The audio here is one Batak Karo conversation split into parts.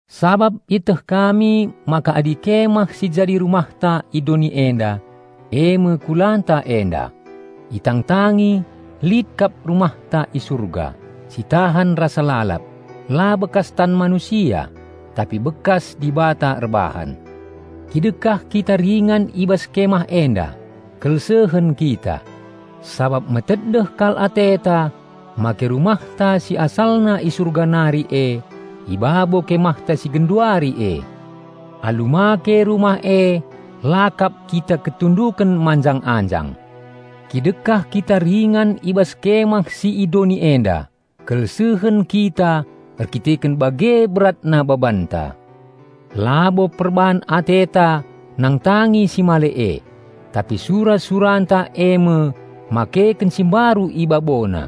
Sabap ieteh kami maka adi kemah si jadi rumahta i doni enda kulanta enda itangtangi, lit kap rumahta i Surga, si tahan rasa lalap, la bekas tan manusia, tapi bekas Dibata erbahan. Kidekah kita ringan i bas kemah enda, kelsehen kita, sabap metedeh kal ateta make rumahta si asalna i Surga nari e i babo kemahta si genduari e. Alu make rumah e, la kap kita ketunduken manjang-anjang. Kidekah kita ringan i bas kemah si i doni enda, kelsehen kita erdandanken bage beratna babanta. Labo perban ateta nangtangi si male e, tapi sura-suranta eme makeken si mbaru i babona,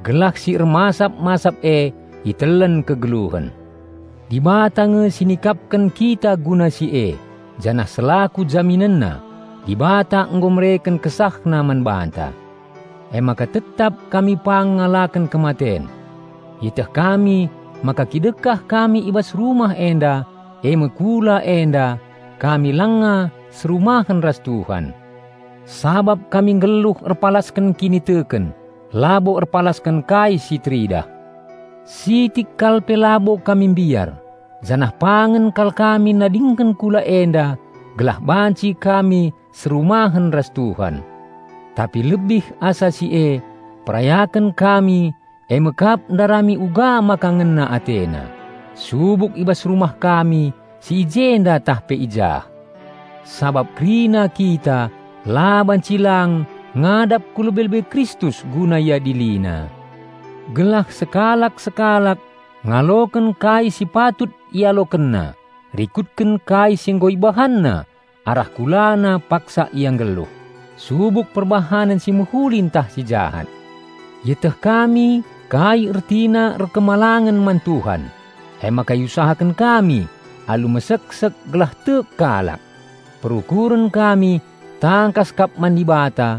gelah si ermasap-masap e itelen kegeluhen. Dibata nge si nikapken kita guna si e, janah selaku jaminenna, Dibata nggo mereken KesahNa man banta. Emaka tetap kami pang ngalaken kematen. Ieteh kami maka kidekah kami i bas rumah enda, eme kula enda, kami langa serumahen ras Tuhan. -- Sabap kami nggeluh erpalasken kiniteken, labo erpalasken kai si teridah. -- Sitik kal pe labo kami mbiar, janah pangen kal kami nadingken kula enda gelah banci kami serumahen ras Tuhan. Tapi lebih asa si e, perayaken kami eme kap ndarami uga maka ngena AteNa, subuk i bas rumah kami si i jenda tah pe i jah. Sabap kerina kita la banci lang ngadap ku lebe-lebe Kristus guna IadiliNa, gelah sekalak-sekalak ngaloken kai si patut ialokenna rikutken kai si nggo ibahanna arah kulana paksa ia nggeluh, subuk perbahanen si mehuli ntah si jahat. Ieteh kami kai ertina erkemalangen man Tuhan, emaka iusahaken kami alu meseksek gelah kalak tek. Perukuren kami tangkas kap man Dibata,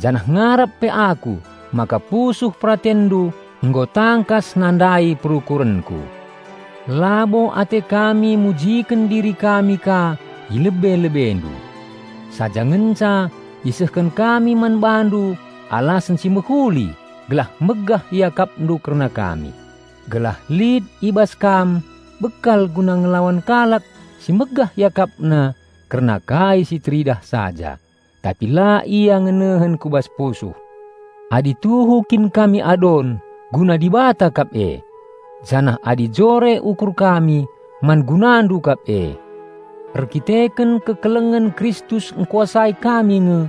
janah ngarap pe aku maka pusuh peratenndu nggo tangkas nandai perukurenku. Labo ate kami mujiken diri kami ka i lebe-lebendu. Saja ngenca isehken kami man bandu alasen si mehuli gelah megah iakapndu kerna kami, gelah lit i bas kam bekal guna ngelawan kalak si megah iakapna kerna kai si teridah saja, tapi la ia ngenehen ku bas pusuh. Adi tuhu kin kami adon, guna Dibata kap e. Janah adi jore ukur kami, man gunandu kap e. Erkiteken keleng ate Kristus ngkuasai kami nge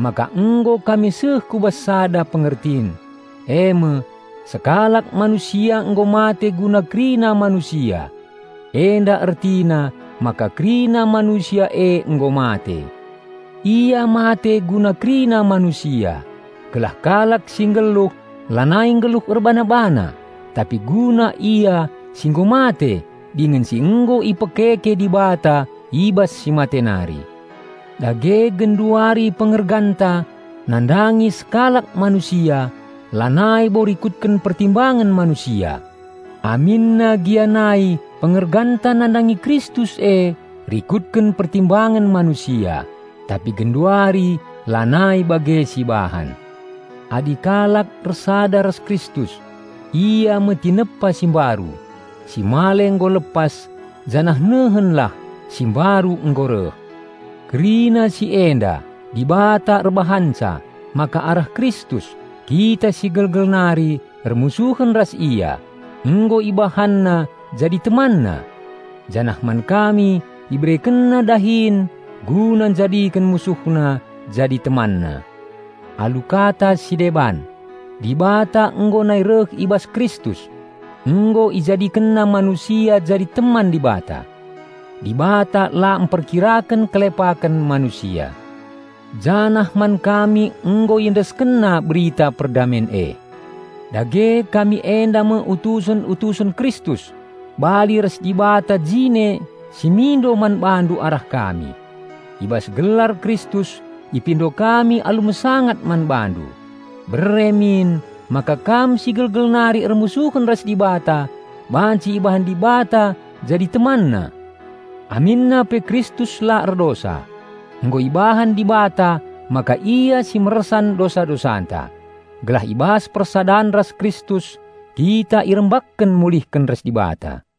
maka nggo kami seh ku bas sada pengertin, eme: sekalak Manusia nggo mate guna kerina manusia. Enda ertina maka kerina manusia e nggo mate. Ia mate guna kerina manusia, gelah kalak si nggeluh lanai nggeluh erbana-bana, tapi guna Ia si nggo mate dingen si nggo ipekeke Dibata i bas si mate nari. Dage genduari pengerganta nandangi sekalak manusia lanai bo rikutken pertimbangen manusia. Aminna gia nai pengerganta nandangi Kristus e rikutken pertimbangen manusia, tapi genduari lanai bage sibahan. Adi kalak ersada ras Kristus, ia me tinepa si mbaru, si male nggo lepas janah nehenlah, si mbaru nggo reh. Kerina si enda Dibata erbahanca, maka arah Kristus, kita si gelgel nari ermusuhen ras Ia, nggo IbahanNa jadi TemanNa. Janah man kami IberekenNa dahin guna njadiken MusuhNa jadi TemanNa. Alu kata si deban: Dibata nggo nai reh i bas Kristus; nggo IjadikenNa manusia jadi teman Dibata. Dibata la mperkiraken kelepaken manusia. Janah man kami nggo IendeskenNa Berita perdamen e. Dage kami enda me utusen-utusen Kristus, bali ras Dibata jine si mindo man bandu arah kami. I bas gelar Kristus ipindo kami alu mesangat man bandu: bere min maka kam si gelgel nari ermusuhen ras Dibata banci ibahan Dibata jadi TemanNa! Aminna pe Kristus la erdosa, nggo ibahan Dibata maka Ia si mersan dosa-dosanta, gelah i bas persadan ras Kristus kita irembakken mulihken ras Dibata.